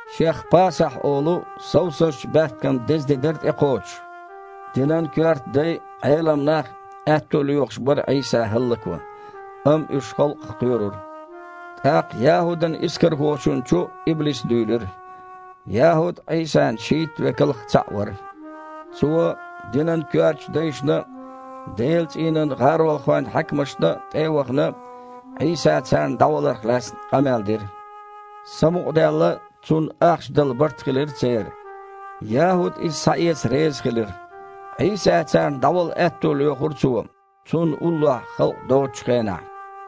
Шех « Пасахь» олу совсазчу баьпкан деза де дара тІекхочуш. Динан коьрта дай а, Іелам нах а аьтто лоьхуш бара Іийса хІаллакван, амма уьш халкъах кхоьрура. ТІаккха ЯхІудана-Искархочунна чу иблис дуьйлира. ЯхІуд Іийсан шийтта векалх цхьаъ вара. Цо, динан коьртачу дайшна а, Делан цІийнан гІаролхойн хьаькамашна а тІе а вахана, Іийса царна дІаваларх лаьцна къамел дира. Самукъадаьлла, цунна ахча дала барт хилира церан. ЯхІуд иза схьаэца реза хилира. Іийса царна дІавала аьтто лоьхура цо, Цунна уллохь халкъ доцучу хенахь.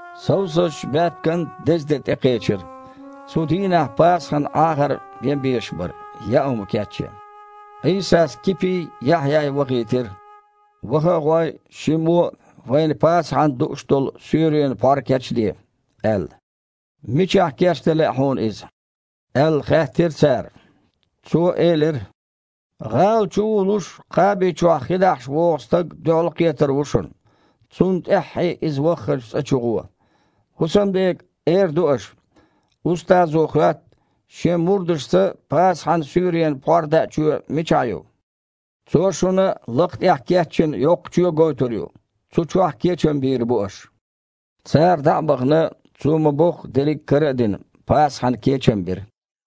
Совсазчу баьпкан деза де тІекхечира. Цу дийнахь Пасахьан Іахар бен безаш бара – яа хІума кечъян. Іийсас Кипий, Яхьъяй вахийтира: «Ваха а гІой, шиммо а вайна Пасахьана дууш долу суьйренан пхьор кечде», – аьлла. «Мичахь кечдан лаьа Хьуна иза?» – аьлла, хаьттира цара. Цо элира: «ГІала чу вулуш, кхаби чохь хи дахьаш вогІу стаг дуьхьалкхетар ву шуна. Цунна тІаьххье иза вахханчу цІа чу гІо. ХІусамдега эр ду аша: „Устазо хоьтту: Шен мурдашца Пасахьан суьйренан пхьор даа чоь мичахь ю?“ Цо шуна лакха тІехь кечйина йоккха чоь гойтур ю, цу чохь кечам бийр бу аш». Цара, дІа а бахана, Цо ма-бохху дерриг кара а дина, Пасахьана кечам бира.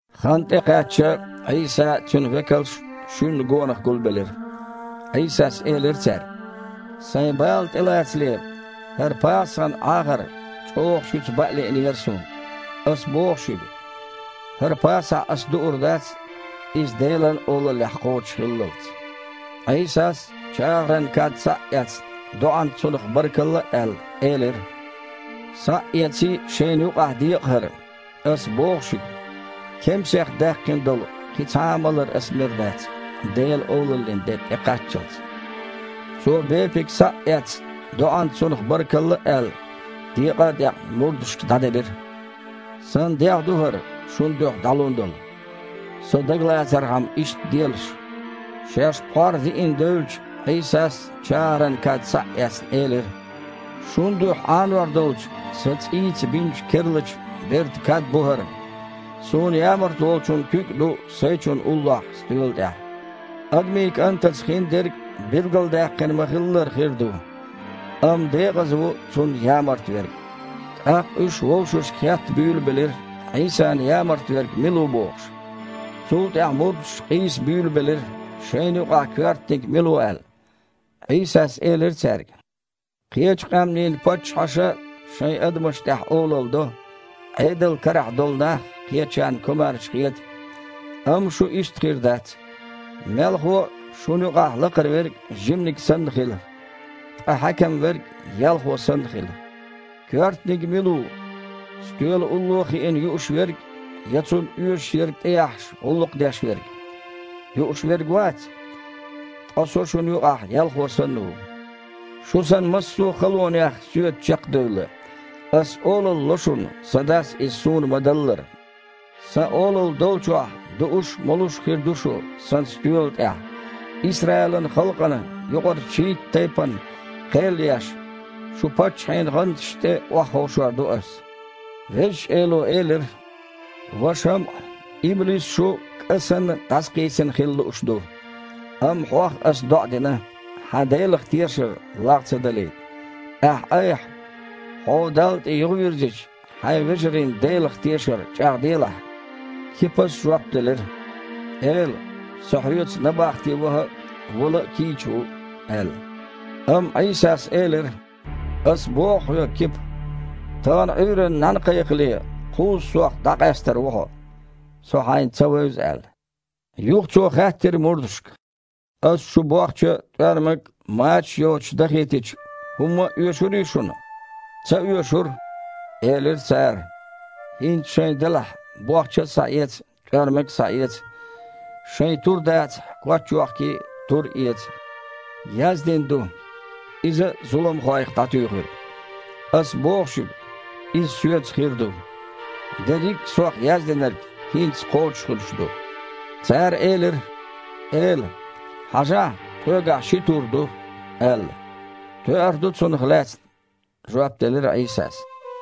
Хан тІекхаьчча, Іийса а, Цуьнан векалш а шуьнна гонах гулбелира. Іийсас элира цаьрга: «Сайн бала тІелацале, хІара Пасахьан Іахар чІогІа шуьца баа лиънера Суна. Ас боху шуьга: хІара Пасахь Ас дуур дац, Иза Делан Олаллехь кхочушхиллалц». Іийсас, чагІаран кад схьа а эцна, доІанца цунах баркалла а аьлла, элира: «Схьа а эций, шайна юкъахь декъа хІара. Ас боху шуьга: кемсех даьккхина долу кхин цхьа а малар Аса мер дац, Делан Олаллин де тІекхаччалц». Цо, бепиг схьа а эцна, доІанца цунах баркалла а аьлла, декъа а декъна, мурдашка дІаделира: «Сан дегІ ду хІара, шун дуьхьа дІалун долу. Со дагалацархьама, иштта делаш». Шаьш пхьор диина девлча, Іийсас, чагІаран кад схьа а эцна, элира: «Шун дуьхьа Іанор долчу Сан цІийца бинчу керлачу бертан кад бу хІара. Суна ямарта волчун куьг а ду Сайчунна уллохь стоьла тІехь. Адамийн КІантаца хиндерг билгалдаьккхина ма-хиллара хир ду, амма декъаза ву Цунна ямарта верг». ТІаккха уьш вовшашка хетта буьйлабелира, Іийсана ямарта верг мила ву бохуш. Цул тІаьхьа мурдаш къийса буьйлабелира, шайна юкъахь коьртаниг мила ву аьлла. Іийсас элира цаьрга: «Кхечу къаьмнийн паччахьаша шайн адамаш тІехь олалла до, Іедал карахь долу нах кхечарна комаьрша хета, амма шу иштта хир дац. Мелхо а, шуна юкъахь лакхара верг жиманиг санна хила, ткъа хьаькам верг – ялхо санна хила. Коьртаниг мила ву: стоьла улло хиина юуш верг я цунна оьшург тІеяхьаш, гІуллакх деш верг? Юуш верг вац? Ткъа Со шуна юкъахь ялхо санна ву. Шу Сан массо а халонех Соьца чекхдевлла, Ас олалла ло шуна, Сан Дас иза Суна ма-даллара. Сан Олалла долчохь дууш а, молуш а хир ду шу Сан стоьла тІехь. Исраилан халкъана юкъарчу шийтта тайпанна кхел а еш, шу паччахьийн гІанташна тІе охьаховшор ду Ас». Везачу Эло элира: «Ва ШамІа! Иблис шу, кІа санна, дІасакхийсина хила лууш ду, амма хьох Ас доІа дина, хьан Делах тешар лагІ ца далийта. Ахь-айхьа, хьо Далла тІе юхавирзича, хьайн вежарийн Делах тешар чІагІделахь». Кипас жоп делира: «Эла! Со Хьоьца набахте ваха а, вала а кийча ву!» – аьлла. Амма Іийсас элира: «Ас боху хьоьга, Кипа, тахана Іуьйранна нІаьна кхайкхале, кхузза Сох дІакъаьстар ву хьо, Со хьайна ца вевза аьлла». Юха Цо хаьттира мурдашка: «Ас шу бохча а, тІоьрмаг а, мачаш а йоцуш дахийтича, хІумма а оьшурий шуна?» «Ца оьшура», – элира цара. «ХІинца, шайн делахь, бохча а схьаэца, тІоьрмаг а схьаэца, шайн тур дацахь, коч йохкий а, тур эца. Яздина ду: „Иза зуламхойх дІатуьйхира“. Ас боху шуьга: иза Соьца хир ду. Дерриг а Сох яздинарг хІинца кхочушхуьлуш ду». Цара элира: «Эла! Хьажахьа, тхоьгахь ши тур ду», – аьлла. «Тоьар ду цунах лаьцна», – жоп делира Іийсас.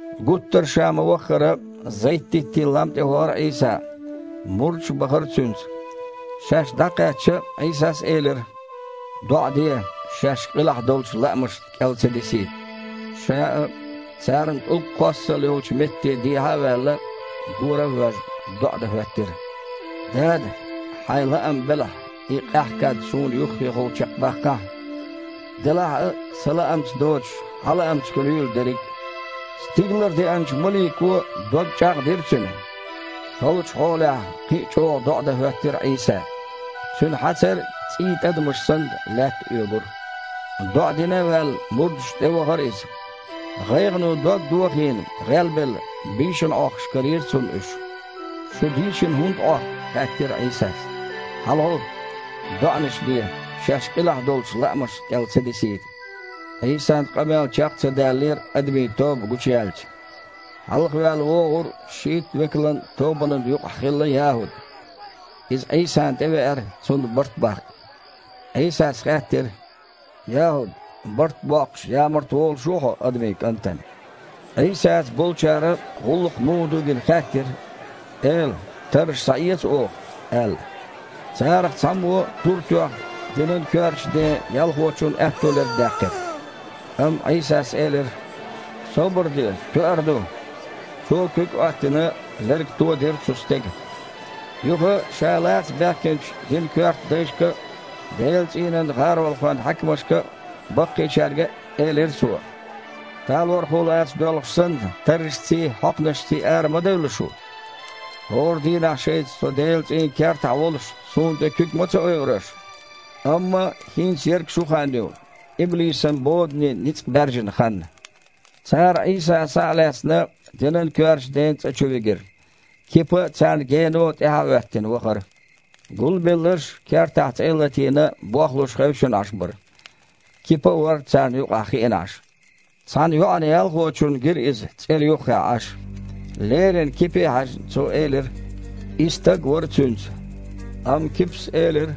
Гуттар а Ша ма-ваххара, Зайт-диттийн лам тІе вахара Іийса. Мурдаш а бахара Цуьнца. Шаьш дІакхаьчча, Іийсас элира: «ДоІа де, шаьш къилахь долчу лаамашна кІел ца дисийта». Ша а царна тІулг кхоссал йолчу метте дехьа а ваьлла, гора а воьжна, доІа дан хІоьттира: «Дада! Хьайн лаам белахь, и къаьхьа кад Суна юххехула чекхбаккхахьа! Делахь а, Сан лаамца доцуш, Хьан лаамца хуьлийла дерриг а». Стигалара деанчу малико дог чІагІдира Цуьнан. Халачу хьолехь кхин а чІогІа доІа дан хІоьттира Іийса. Цуьнан хьацар, цІийн тІадамаш санна, лаьтта оьгура. ДоІа дина а ваьлла, мурдашна тІевахара Иза. ГІайгІано дог дохийна, гІелбелла, бийшина Іохкуш карийра Цунна уьш. «Шу дийшина хІунда Іохку? – хаьттира Іийсас – ХьалагІовтта, доІанаш де, шаьш къилахь долчу лаамашна кІел ца дисийта». Іийсан къамел чекх ца даьллера, адамийн тоба гучуяьлча. Хьалха ваьлла вогІура шийта векалан тобанан юкъахь хилла ЯхІуд. Иза Іийсана тІевеара – Цунна барт баккха. Іийсас хаьттира: «ЯхІуд, барт а боккхуш, ямарта волуш ву хьо Адамийн КІантана?» Іийсаца болчара, гІуллакх муха ду а гина, хаьттира: «Эла, тарраш схьаэца оха?» – аьлла. Царах цхьаммо тур тоьхна динан коьртачу ден ялхочун аьтту лерг даьккхира. Амма Іийсас элира: «Собар де, тоьар ду!» Цо, куьг Іоьттина, лерг тодира цу стеган. Юха Ша лаца баьхкинчу динан коьрта дайшка а, Делан цІийнан гІаролхойн хьаькамашка а, баккхийчаьрга а элира Цо: «Талорхо лаца доьлхуш санна, таррашций, хьокханашций ара ма девлла шу! ХІора дийнахь шайца Со Делан цІийнан кертахь волуш, Суна тІе куьг ма ца ойура аш. Амма хІинца ерг шун хан ю, иблисан бодане ницкъ баьржина хан». Цара Іийса, схьа а лаьцна, динан коьртачу ден цІа чу вигира. Кипа, царна гено тІаьхьа а хІоьттина, вахара. Гулбелларш, кертахь цІе а латийна, бохлуш хевшина Іаш бара. Кипа а вара царна юкъахь хиъна Іаш. Цхьана йоІана-ялхочунна гира иза цІера юххехь Іаш. Леррина Кипе а хьаьжна, цо элира: «И стаг а вара Цуьнца». Амма Кипас элира: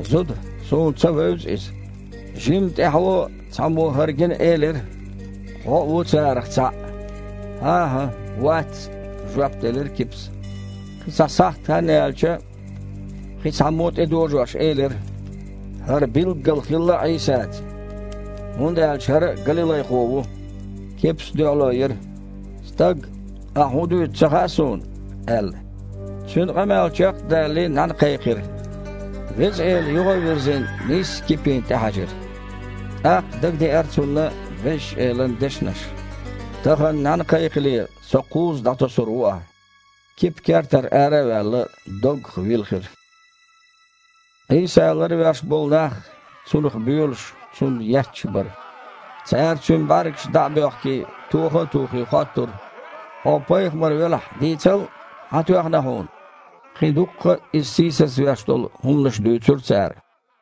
«Зуда, суна ца вевза Иза». Жимма тІаьхьо цхьаммо, хІара гина, элира: «Хьо а ву царах цхьаъ». «ХІан-хІа, вац», – жоп делира Кипас. Кхин цхьа сахьт хан яьлча, кхин цхьаммо а, тІедожош, элира: «ХІара билггала хилла Іийсаца, хІунда аьлча хІара а галилайхо ву». Кипас дуьхьало йира: «Стаг, ахь хІун дуьйцу ца хаьа суна», – аьлла. Цуьнан къамел чекх а далале, нІаьна кхайкхира. Веза Эла, юха а вирзина, нийсса Кипина тІе хьаьжира. ТІаккха дагадеара цунна Везачу Элан дешнаш: «Тахана нІаьна кхайкхале, Со кхузза дІатосур ву ахь». Кипа, кертара ара а ваьлла, доггах вилхира. Іийса ларвеш болу нах Цунах боьлуш, Цунна етташ бара. Цара, Цуьнан бІаьргаш дІа а боьхкий, тоха а тухий, хоттура: «Хьо пайхамар велахь, дийцал, хьан тоьхна Хьуна?» Кхин дуккха а Иза сийсазвеш долу хІуманаш дуьйцура цара.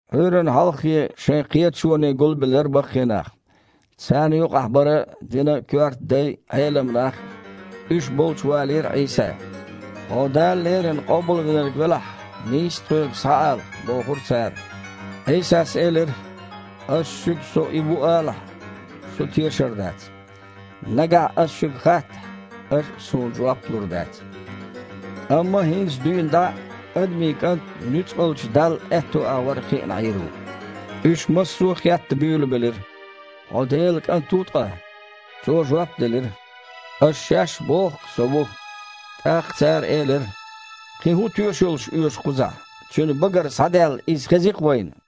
Іуьйранна хьалххе шайн кхеташоне гулбелира баккхий нах. Царна юкъахь бара динан коьрта дай а, Іелам нах а. Уьш болчу валийра Іийса. «Хьо Дала Леррина Къобалвинарг велахь, нийсса тхоьга схьаала», – бохура цара. Іийсас элира: «Ас шуьга Со И ву алахь, шу тешар дац. Нагахь Ас шуьга хаттахь, аш а Суна жоп лур дац. Амма хІинца дуьйна дІа Адамийн КІант Нуьцкъалчу Далла аьтту агІор хиъна Іийр ву». Уьш массо а хетта буьйлабелира: «Хьо Делан КІант ву ткъа?» Цо жоп делира: «Аш шаьш а боху-кх Со ву». ТІаккха цара элира: «Кхин хІун тоьшаллаш оьшу кхузахь? Цуьнан багара схьадаьлла иза хези-кх вайна!»